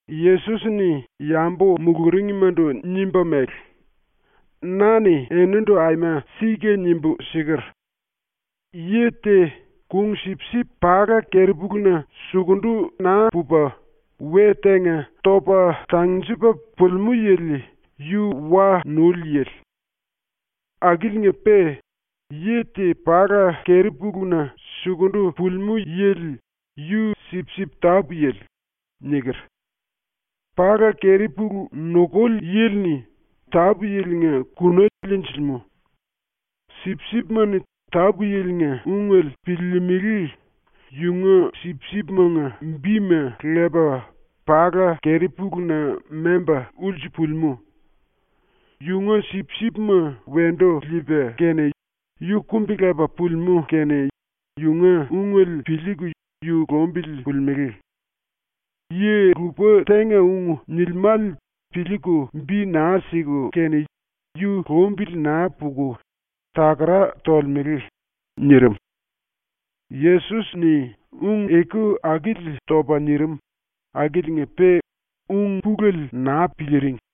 ⸤Yesos-ni yambu muluringmandu nimba mele:⸥ “Na-ni enindu aima sika nimbu siker: “Yi te kung-sipsip pala keri-puluna sukundu naa pupa, we tenga topa tangnjepa pulimú yili yu wa nuli yili. Akiliinga-pe yi te pala keri-puluna sukundu pulimú yili yu sipsip tápu-yili.” niker. Pala keri-pulu nukuli yili-ni tápu-yilinga kuna liinjilimú. Sipsipima-ni tápu-yilinga ungele piliilimili, yunga sipsipimanga bima lepa pala keri-puluna memba ulsu pulimú. Yunga sipsipma wendu liipa kene, yu kumbi-lepa pulimú kene yunga ungele piliiku yu lumbili pulimelé. Yi-lupa tenga ung nilimále piliiku bi naa siku kene yu lumbili naa puku takara tolemele.” nirim. Yesos-ni ung-eku akili topa nirim akiliinga-pe ung-pulele naa piliiring.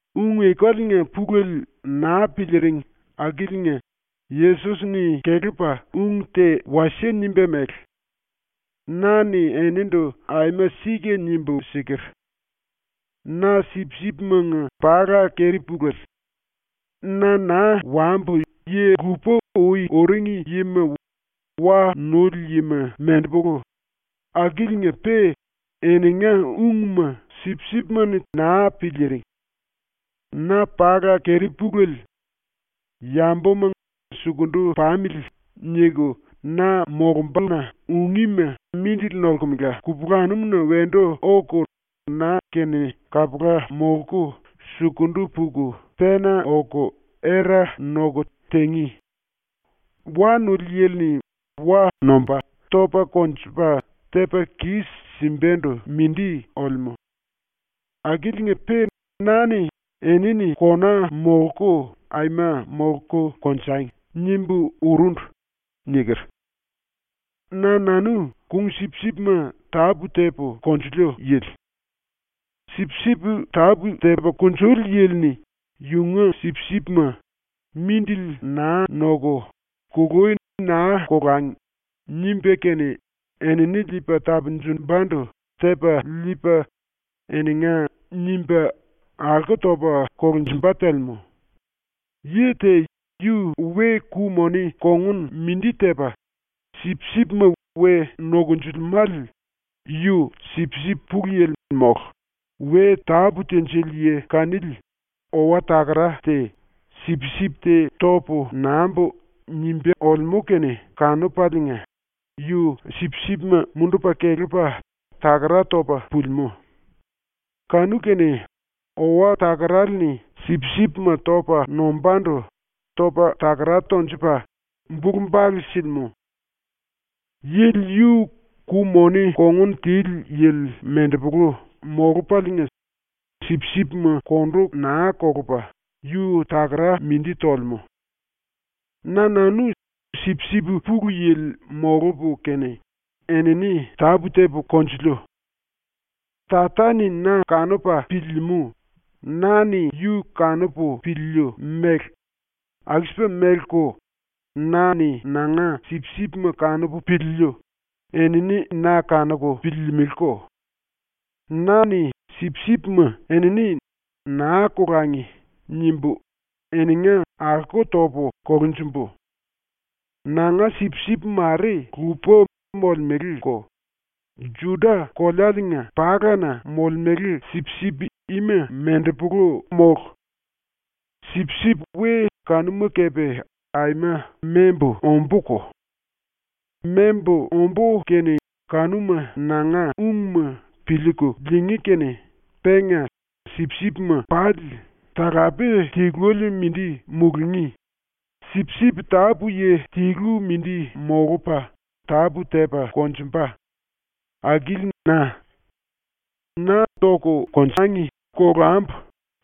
⸤Ung-ekaliinga pulele naa piliiring⸥ akiliinga Yesos-ni kelepa ung te wasie nimba mele: “Na-ni enindu aima sika nimbu siker: “Na sipsipimanga pala keri-puléle. Na naa wambu yi-lupa ui uring yima wa nuli yima mendepolu, akiliinga-pe eninga ungma sipsipima-ni naa piliiring. Na pala keri-puléle. Yambuma ‘Sukundu pamili.’ niku na molumbuna ungíma mindili nolkemela kupulanum-na wendu oku na-kene kapula molku sukundu puku pena oku era noku tingí. Wa nuli yili-ni wa nomba, topa konjupa, tepa kis-simbandu mindi olemú. Akiliinga-pe na-ni ‘Enini kona molku aima molku konjangi.’ nimbu urundu.” niker. “Na-nanu kung-sipsipma tápu-tepu konjiliu yili. Sipsip tápu-tepa kunjuli yili-ni yunga sipsipma ‘Mindili naa noku, kului naa kolangi.’ nimba kene enini liipa tapunjumbandu tepa liipa, ‘eninga’ nimba alko topa kolunjumba telemú. Yi te yu we ku-moni kongun mindi tepa sipsipma we nokonjilimále, yu sipsip pulu-yili mólu, we tápu tinjili yi kanili owa-takara te ‘Sipsip te topu nambu.’ nimba olemú kene kanupaliinga, yu sipsipma mundupa kelepa takara topa pulimú. Kanu-kene owa-takarale-ni sipsipma topa nombandu topa takara tonjupa bulu-bale silimú. Yili yu ku-moni kongun tili yili mendepolu molupaliinga, sipsipma kondu naa kolupa yu takara mindi tolemú. “Na-nanu sipsip pulu-yili molupu kene enini tápu-tepu konjiliu. Tata-ni na kanupa piliilimú na-ni yu kanupu piliiliu mele aku-sipa meleko, na-ni nanga sipsipma kanupu piliiliu enini na kanuku piliilimiliko. Na-ni sipsipma enini ‘Naa kolangi.’ nimbu eninga alko topu kolunjumbu. Nanga sipsip mare lupa molemeleko, ⸤Juda-⸥kolealiinga palana molemele sipsip ima ⸤mendepolu⸥ mólu. Sipsip we kanuma kepe aima membu ombúko. Membu ombú kene kanuma nanga ungma piliiku liingí kene penga sipsipma pali talape tiluele mindi mulungí, sipsip tápu-yi tilu mindi molupa tápu-tepa konjumba. Akili na. “‘Na tangi kolambu.’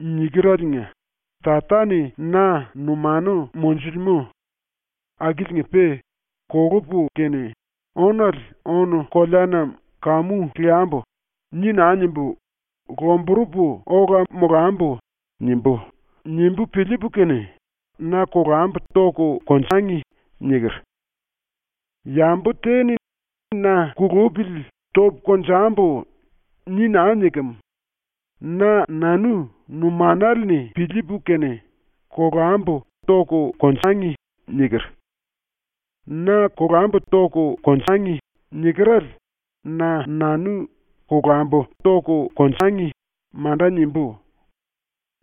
nikereliinga Tata-ni na numanu monjulemú. Akiliinga-pe ‘ ‘Kolupu kene ónale ónu-koleana kamu leambu.’ ni naa nimbu, ‘Lomburupu ola molambu.’ nimbú.’ nimbu piliipu kene ‘Na kolambu tangi.’ niker. Yambu te-ni na ‘Kulupili topu konjambu.’ ni naa nikem; na-nanu numanale-ni piliipu kene ‘Kolambu tangi.’ niker. ‘Na kolambu tangi.’ nikerale na-nanu ‘Kolambu tangi.’ manda nimbú.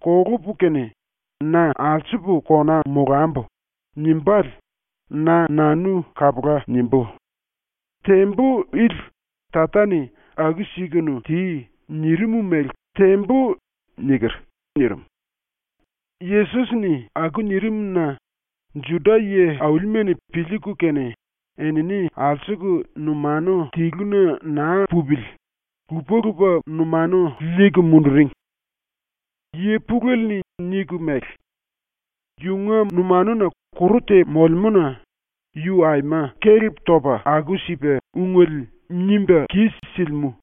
Kolupu kene, ‘Na alsupu kona molambu.’ nimbále na-nanu kapula nimbú. Tembu ili Tata-ni “Aku-sikunu ti.” nirim mele tembu.” nirim. Yesos-ni aku nirim-na Juda yi-aulima-ni piliiku kene enini alsuku numanu tiluna naa pupili lupa-lupa numanu liiku munduring. Yi pulele-ni niku mele: “Yunga numanuna kuru te molemú-na yu aima kelep topa aku-sipa ungele nimba kis-silimú.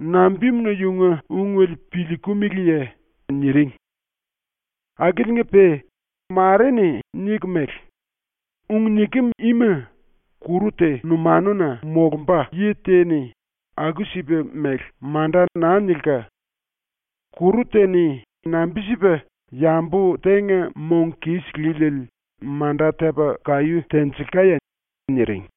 Nambimuna yunga ungele piliikimiliye?” niring. Akiliinga-pe mare-ni niku mele: “Ung nikem ima kuru te numanuna molumba yi te-ni aku-sipa mele manda naa nilka. Kuru te-ni nambi-sipa yambu tenga mong kis líliele manda tepa kaí tenjilkaye?” niring.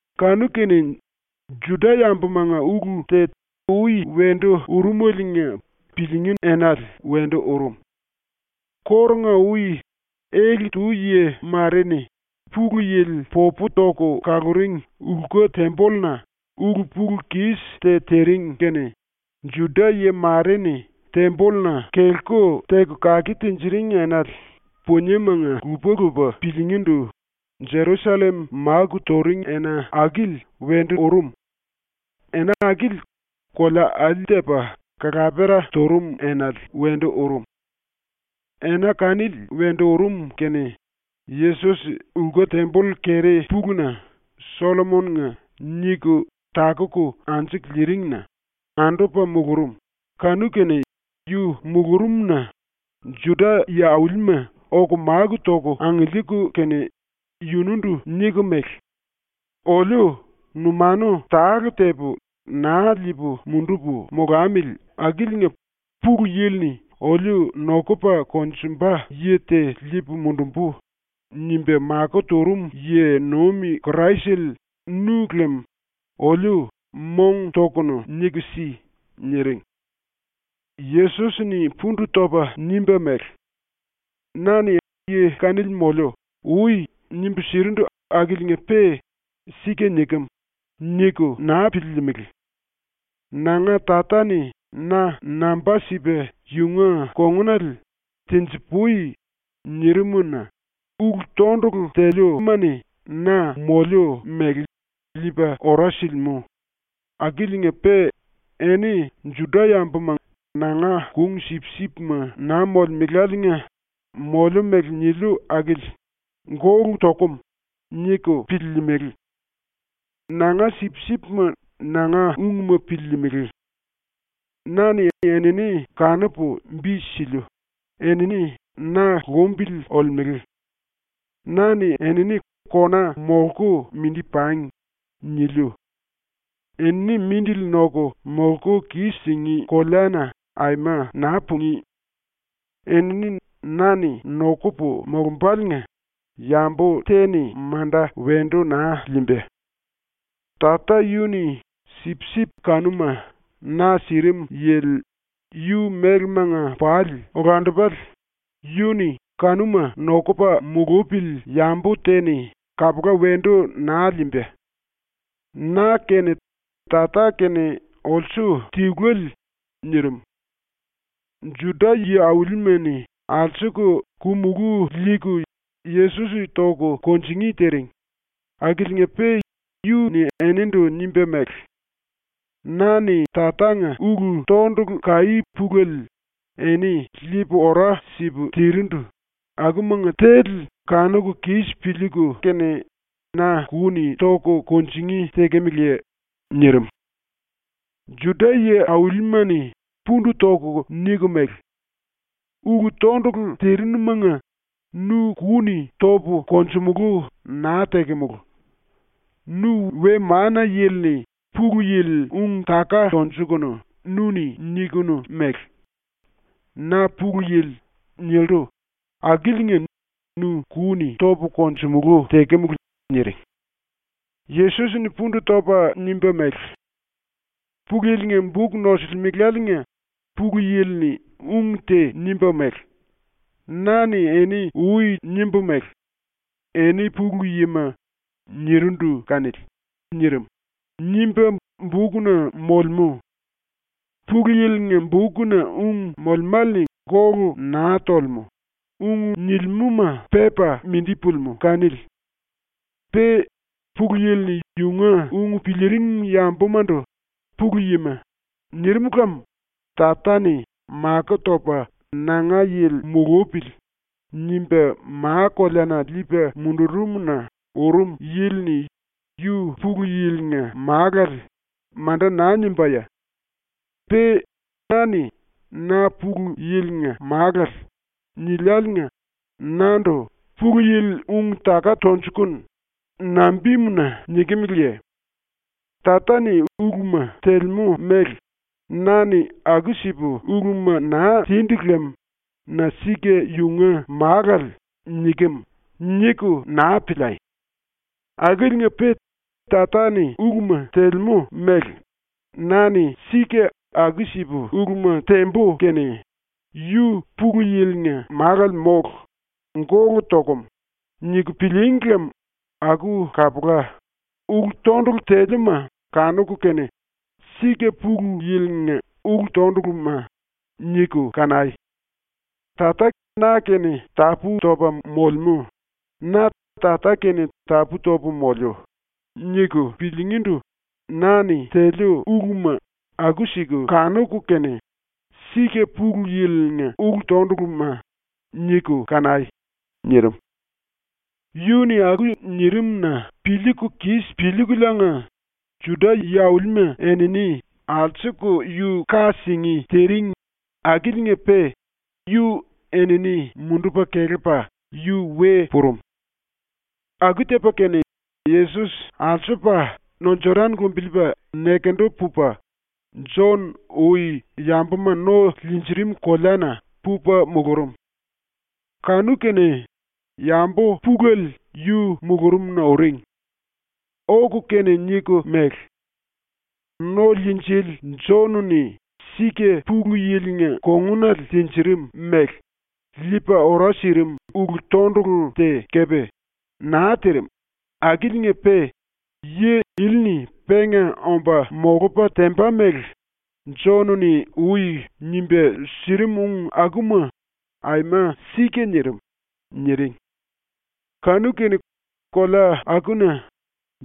Kanu-kene Juda-yambumanga ulu te ui wendu urumeliinga piliingí enale wendu urum. Kórunga-ui ⸤ele-tu yi mare-ni⸥ Pulu Yili popu toku kaluring lku-tembolluna ⸤ulu-pulu-kis te tiring kene⸥ Juda-yi mare-ni tembolluna kelku teku kake tinjiring enale puniemanga lupa-lupa piliingíndu Jerusallem máku turing ena akili wendu urum. Ena akili kolea alí tepa kalapera turum enale wendu urum. Ena kanili wendu urum kene Yesos lku-temboll keri-puluna ‘Sollomon-nga’ niku takuku anju liiring-na andupa mulurum kanu-kene yu mulurumna Juda yi-aulima oku máku toku angiliiku kene yundu niku mele: “Oliu numanu tale-tepu naa liipu mundupu molamili akiliinga Pulu Yili-ni ‘Oliu nokupa konjumba yi te liipu mundumbu.’ nimba makó turum yi-nuim Kraisele nu lem oliu mong-tokunu niku si.” niring. Yesos-ni pundu topa nimba mele: “Na-ni yi kanili moliu ui nimbu sirindu akiliinga-pe ‘Sika nikem.’ niku naa piliilimili. Nanga Tata-ni na namba sipa yunga kongunale “tenji-pui.” nirim-na ulu-tondulu teliuma-ni na moliu mele liipa ora silimú, akiliinga-pe eni ⸤Juda-yambuma⸥ nanga kung-sipsipma naa molemeláliinga ⸤moliu mele niliu akili⸥ ‘Gólu tokum.’ niku piliilimili. Nanga sipsipma nanga ungma piliilimili. Na-ni enini kanupu bi siliu, enini na lumbili olemele. Na-ni enini ‘kona molku mindi pangi.’ niliu. Enini mindili noku molku kis-singí koleana aima naa pungí. Enini na-ni nokupu molombaliinga yambu te-ni manda wendu naa liimba. Tata yu-ni sipsip kanuma na sirim yili yu mélemanga pali olandupale, yu-ni kanuma nokupa mulupili yambu te-ni kapula wendu naa liimba. Na kene Tata kene olsu tiluele.” nirim. Juda yi-aulima-ni alsuku ku-mulú liiku Yesos toku kunjingí tiring, akiliinga-pe yu-ni eninindu nimba mele: “Na-ni Tatanga ulu-tondulu kaí pulele eni liipu ora sipu tirindu, akumanga tele kanuku kis piliiku kene na ku-ni toku kunjingí tekemeleye?” nirim. Juda yi-aulima-ni pundu toku niku mele: “Ulu-tondulu tirinumanga nu ku-ni topu konjumulú naa tekemulu. Nu we-mana-yili-ni Pulu Yili ung-taka tonjukunu nu-ni nikunu mele: “Na Pulu Yili.” nillu, akiliinga nu ku-ni topu konjumulú tekemulu.” niring. Yesos-ni pundu topa nimba mele: “Pulu Yili-nga buk nosilimeláliinga Pulu Yili-ni ung te nimba mele: “Na-ni eni ui nimbu mele: ‘Eni pulu yima.’ nirindu kanili.” nirim, nimba bukna molemú. Pulu Yili-nga bukna ung molemále-ni gólu naa tolemú, ung nilimúma pepa mindi pulimú kanili. Pe Pulu Yili-ni yunga ung piliiring yambumandu “pulu yima.” nirim lem Tata-ni makó topa ‘nanga yili mulupili.’ nimba ma-koleana liipa mundurum-na urum yili-ni “yu Pulu Yili-nga Málale.” manda naa nimbáye? Pe na-ni “Na Pulu Yili-nga Málale.” niliáliinga nandu “Pulu Yili ung-taka tonjukunu.” nambimuna nikimeleye? Tata-ni uluma telemú mele na-ni aku-sipu uluma naa tindu lem na ‘sika yunga málale nikem’ niku naa piliai! Akiliinga-pe Tata-ni uluma telemú mele na-ni sika aku-sipu uluma tembu kene ‘Yu Pulu Yili-nga Málale mólu. Gólu tokum.’ niku pilííngi lem aku kapula, ulu-tondulu teliuma kanuku kene ‘Sika Pulu Yili-nga ulu-tonduluma.’ niku kanai. ‘Tata na-kene tapú-topa molemú, na Tata-kene tapú-topu moliu.’ niku piliingíndu na-ni teliu uluma aku-siku kanuku kene ‘Sika Pulu Yili-nga ulu-tonduluma.’ niku kanai.” nirim. ⸤Yu-ni aku nirim-na piliiku kis piliikuliinga⸥ ⸤Juda yi-aulima⸥ enini alsuku yu ka singí tiring akiliinga-pe yu enini mundupa kelepa yu we purum. Aku tepa kene, Yesos alsupa no Jodan lumbiliipa nekendu pupa, Jon ui yambuma no liinjirim koleana pupa mulurum. Kanu-kene yambu pulele yu mulurumna uring. Oku kene niku mele: “⸤No-Liinjili⸥ Jon-ni sika ⸤Pulu Yili-nga kongunale tinjirim mele⸥ liipa ora sirim ulu-tondulu te kepe naa tirim, akiliinga-pe yi ili-ni penga omba molupa temba mele Jon-ni ui nimba sirim ung akuma aima sika nirim.” niring. Kanu-kene kolea akuna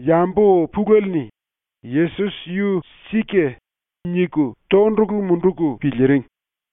yambu pulele-ni ‘Yesos yu sika.’ niku tondulu munduku piliiring.